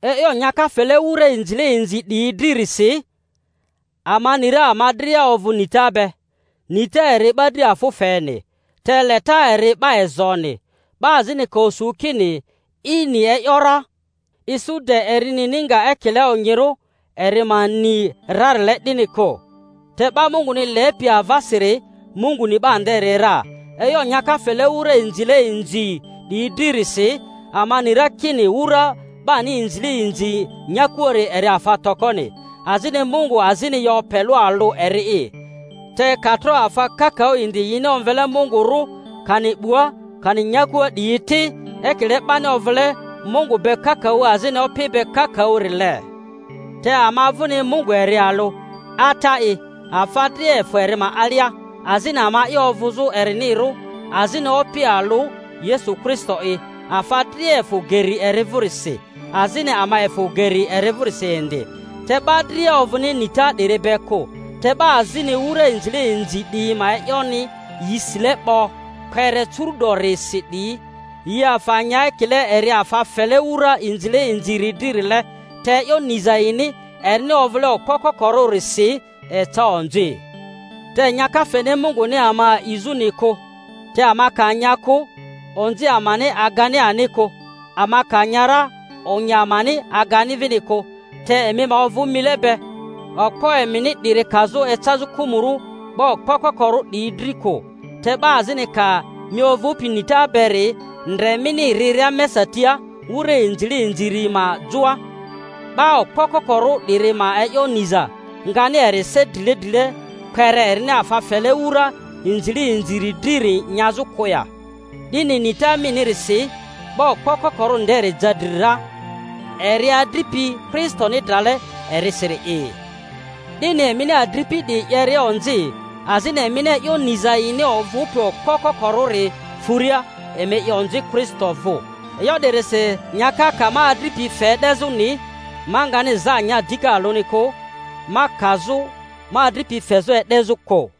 E'yo nyaka fele wura inzile inzi 'diyi dririsi: ama ni ra ama dria ovᴜ nita be. Nita eri 'ba dri afᴜ feni, te leta eri 'ba ezoni. 'Ba azini ka osu kini i ni e’yo ra, isu de eri nini nga ekile onyirᴜ eri ma ni rarile 'dini kᴜ. Te 'ba Munguni lepi avasiri, Mungu ni 'ba nderi ra. E'yo nyaka fele wura inzile inzi 'diyi dririsi, ama ni ra kini wura 'bani inzile inzi nyakuari eri afa tokoni, azini Mungu azini yo pe alᴜ eri'i. Te ka tro afa kakaᴜ indi yini omvele mungurᴜ, kani 'bua kani nyakua 'diyi ti—ekile 'bani ovᴜle mungu be kakaᴜ azini opi be kakaᴜ-rile— te ama vᴜni Mungu eri alᴜ, Ata'i, afa dria efᴜ eri ma alia, azini ama'i ovᴜzᴜ erinirᴜ; azini Opi alᴜ, Yesu Kristo'i, afa dria efᴜ geri eri vᴜrisi, azini ama efᴜ geri eri vᴜrisi indi. Te 'ba dria ovᴜni nita 'diri be kᴜ. Te 'ba azini, wura inzile inzi 'diyi ma e'yoni yi sile 'bo kpere curu'dorisi 'diyi, yi afa nya ekile eri afa fele wura inzile inziri dririle; te e'yo niza yini, erini ovᴜle okpo kokorᴜrisi, eca onzi. Te nyaka feni Munguni ama a'izᴜni kᴜ. Te ama ka nya kᴜ, onzi amani agani ani kᴜ; ama ka nya ra, onyi amani agani vini kᴜ. Te emi ma ovᴜ mile be, okpo emini 'diri kazᴜ ecazᴜ kᴜmᴜrᴜ 'ba okpo kokorᴜ 'diyi dri kᴜ. Te 'ba azini ka mi, ovᴜpi nita beri, ndre mini riria mesa tia wura inzile inziri ma joa, 'ba okpo kokorᴜ 'diri ma e'yo niza ngani eri se drile drile kpere erini afa fele wura inzile inziri driri nyazᴜ kᴜ ya? 'Dini nita minirisi, 'ba okpo kokorᴜ nderi ja dri ra, eri adripi Kristoni drale erisiri'i. 'Dini emini adripi 'diyi 'yeria onzi, azini emini e'yo niza yini ovᴜpi okpo kokorᴜri furia, emi 'ye onzi Kristo vᴜ. E'yo 'dirisi, nyaka ka ma adripi fe e'dezᴜni, ma ngani za nya dika alᴜni kᴜ, ma kazᴜ ma adripi fezᴜ e'dezᴜ kᴜ.